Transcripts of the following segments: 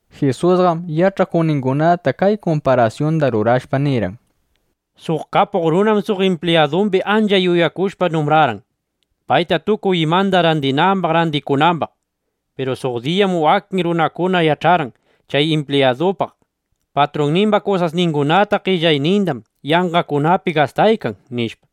Jisusqam yach'akuqningunata kay kumparasyunda rurashpa nirqan: —Suq kapuq runam suq impliyadumbi ancha yuyakushpa numbrarqan, payna tukuy imanda randinambaq randikunambaq. Piru suq diyam wakin runakuna yach'arqan chay impliyadupaq: Patrunnimba kusasningunata, qellaynindam yanqakunapi gastaykan, nishpa.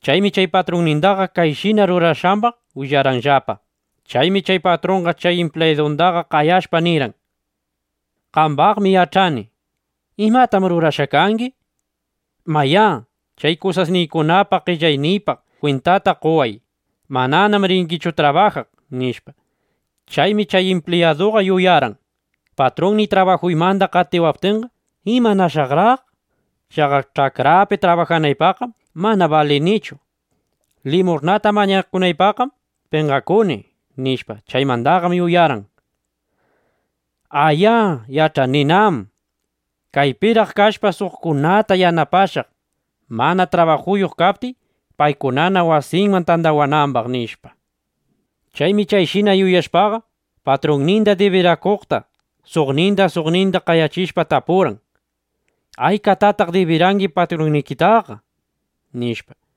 Chaymi chay patrunnindaqa chayshina rurashqambaq willarqanllapa. Chaymi chay patrunqa chay impliyadundaqa qayashpa, nirqan: “Qambaqmi yach'ani. ¿Imatam rurashqa kangi? Mayá, chay kusasniykunapaq, qellayniypaq kwintata qoway. Mananam ringichu trabajaq”, nishpa. Chaymi chay impliyaduqa yuyarqan: “Patrunniy trabajuymanda qatiwaptinqa, ¿imanashaqraq? Chaqa ch'akrapi trabajanaypaqqam mana balinichu. Limush'nata mañakunaypaqqam penqakuni”, nishpa. Chaymandaqam yuyarqan: “¡A, ya yach'aninam! Kaypiraq kashpa, suqkunata yanapashaq, mana trabajuyuq kaptiy, paykunana wasinman tandawanambaq”, nishpa. Chaymi chayshina yuyashpaqa, patrunninda dibiraqkunata, suqninda suqninda qayachishpa, tapurqan: “¿Aykatataq dibirangi patrunniytaqa?” nishpa.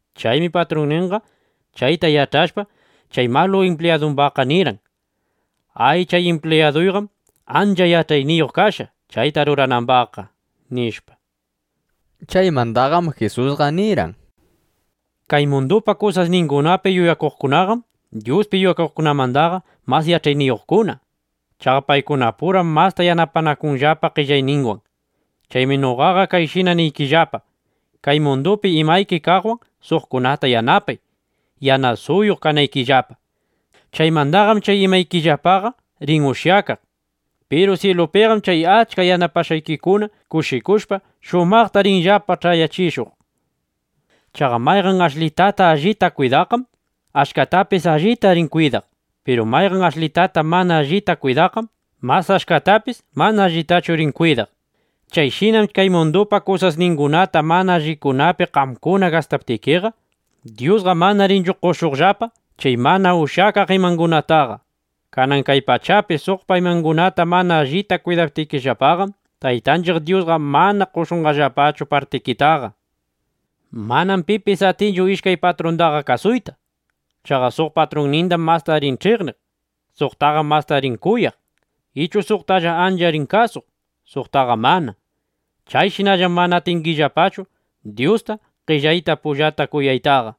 Chaymi patrunninqa chayta yach'ashpa, chay malu impliyadumbaqqa nirqan: “Ay, chay impliyaduyqam ancha yach'ayniyuq kashqa, chayta ruranambaqqa”, nishpa. Chaymandaqam Jisusqa nirqan: —Kay mundupa kusasningunapi yuyakuqkunaqam Dyuspi yuyakuqkunamanda mas yach'ayniyuqkuna. Chaqa paykunapuram masta yanapanakunllapa qellayninwan. ’Chaymi noqaqa kayshina niykillapa, kay mundupi imayki kaqwan suqkunata yanapay, yanasuyuq (yanasayuq) kanaykillapa. Chaymandaqam chay imaykillapaqa rin ushyakaq. Piru syilupiqam chay achka yanapashqaykikuna kushikushpa, shumaqta rinllapa ch'ayachishuq. ’Chaqa mayqan ashlitata allita kwidaqqam, achkatapis allita rin kwidaq. Piru mayqan ashlitata mana allita kwidaqqam mas achkatapis mana allitachu rin kwidaq. Chayshinam kay mundupa kusasningunata mana allikunapi qamkuna gastaptikiqa, Dyusqa mana rinchu qoshuqllapa chay mana ushyakaq imangunataqa. Kanan kay pachapi suqpa imangunata mana allita kwidaptikillapaqam, Taytanchiq Dyusqa mana qoshunqallapachu partikitaqa. ’Manam pipis atinchu ishkay patrundaqa kasuyta. Chaqa suq patrunnindam masta rin ch'iqniq; suqtaqam masta rin kuyaq. Ichu suqtalla ancha rin kasuq, suqtaqa mana. Chayshinallam mana atingillapachu Dyusta, qellayta pullata kuyaytaqa.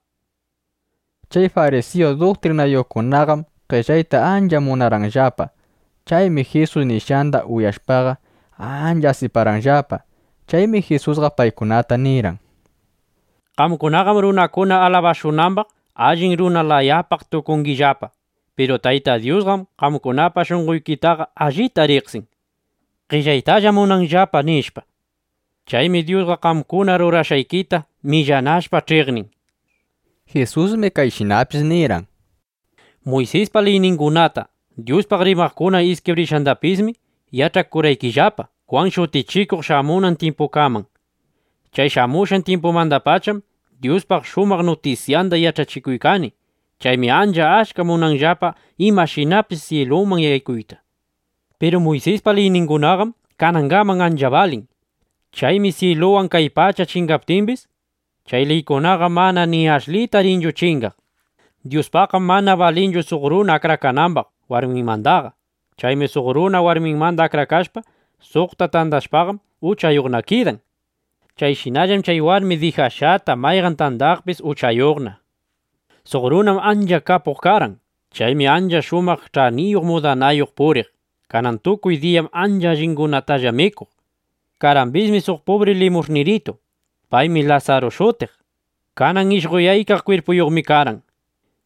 Chay farisiyu duktrinayuqkunaqam qellayta ancha munarqanllapa. Chaymi Jisus nishqanda uyashpaqa, ancha asiparqanllapa. Chaymi Jisusqa paykunata nirqan: —Qamkunaqam runakuna alabashunambaq, allin runa layapaq tukungillapa. Piru Tayta Dyusqam qamkunapa shunqoykitaqa allita riqsin: Qellaytallam munanllapa, nishpa. Chaymi Dyusqa qamkuna rurashqaykita millanashpa ch'iqnin. Jisusmi kayshinapis nirqan: —Muysispa liyningunata, Dyuspaq rimaqkuna iskibrishqandapismi yach'akurqaykillapa Jwan Shutichikuq shamushqan tyimpukaman. Chay shamushqan tyimpumandapacham Dyuspa shumaq nutisyanda yach'achikuykani. Chaymi ancha achka munanllapa imashinapis syiluman yaykuyta. Piru Muysispa liyningunaqam kanangaman ancha balin. Chaymi syiluwan kay pacha chingaptimbis, chay liykunaqa mana ni ashlita rinchu chingaq. ’Dyuspaqqam mana balinchu suq runa akrakanambaq warminmandaqa. Chaymi suq runa warminmanda akrakashpa, suqta tandashpaqam, uchayuqna kidan. Chayshinallam chay warmi dijashqata mayqan tandaqpis uchayuqna. ’Suq runam ancha kapuq karqan. Chaymi ancha shumaq ch'aniyuq mudanayuq puriq. Kanan tukuy diyam ancha allingunatalla mikuq. Karqambismi suq pubri limush'niritu. Paymi Lasaru shutiq. Kanan ishqoyaykaq kwirpuyuqmi karqan.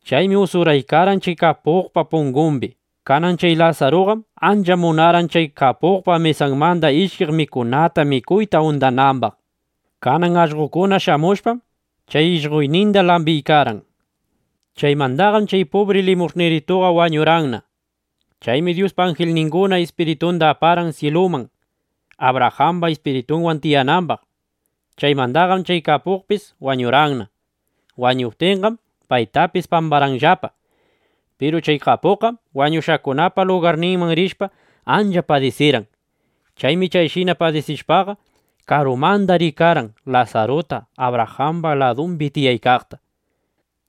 Chaymi usuraykarqan chay kapuqpa pungumbi. Kanan chay Lasaruqam ancha munarqan chay kapuqpa mesanmanda ishkiq mikunata mikuyta undanambaq. Kanan allqokuna shamushpam, chay ishqoyninda lambiykarqan. Chaymandaqam chay pubri limush'nirituqa wañurqanna. Chaymi Dyuspa anjilninguna ispiritunda aparqan syiluman, Abrajamba ispiritunwan tiyanambaq. Chaymandaqam chay kapuqpis wañurqanna. Wañuptinqam paytapis pambarqanllapa. Piru chay kapuqqam wañushqakunapa lugarninman rishpa, ancha padisirqan. Chaymi chayshina padisiykashpaqa, karumanda rikarqan Lasaruta, Abrajamba ladumbi tiyaykaqta.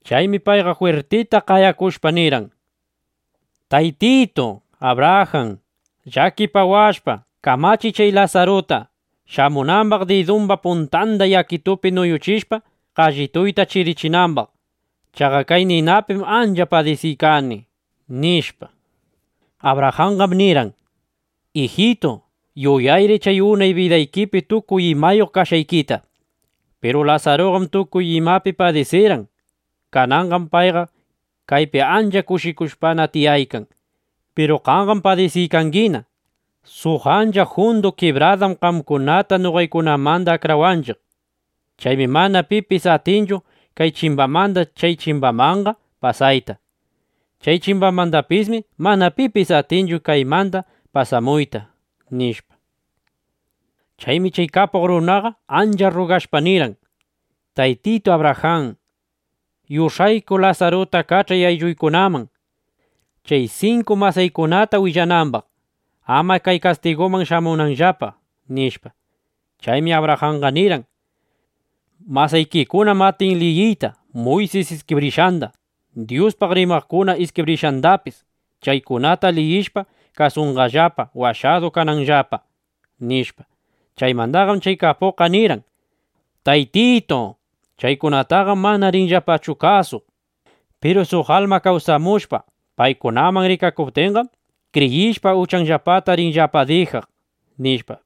Chaymi payqa jwirtita qayakushpa, nirqan: “Taytitu Abrajan, llakipawashpa, kamachiy chay Lasaruta, shamunambaq didumba puntanda yakitupi nuyuchishpa, qallituyta chirichinambaq. ¡Chaqa kay ninapim ancha padisiykani!” nishpa. Abrajanqam nirqan: “Ijitu, yuyayri chay unay bidaykipi tukuy imayuq kashqaykita. Piru Lasaruqam tukuy imapi padisirqan. Kananqam payqa kaypi ancha kushikushpana tiyaykan. Piru qamqam padisiykangina. Suq ancha jundu kibradam qamkunata noqaykunamanda akrawanchiq. Chaymi mana pipis atinchu kay chimbamanda chay chimbamanqa pasayta. Chay chimbamandapismi mana pipis atinchu kaymanqa pasamuyta”, nishpa. Chaymi chay kapuq runaqa ancha rrugashpa nirqan: “Taytitu Abrajan, yush'ayku Lasaruta kach'ay aylluykunaman, chay sinku masaykunata willanambaq, ama kay kastiguman shamunanllapa”, nishpa. Chaymi Abrajanqa nirqan: “Masaykikunam atin liyiyta Muysis iskibrishqanda, Dyuspaq rimaqkuna iskibrishqandapis. Chaykunata liyishpa, kasunqallapa, washadu kananllapa”, nishpa. Chaymandaqam chay kapuqqa nirqan: “¡Taytitu, chaykunataqam mana rinllapachu kasuq! Piru suq alma kawsamushpa, paykunaman rikakuptinqam, kriyishpa, uchanllapata rinllapa dijaq”, nishpa.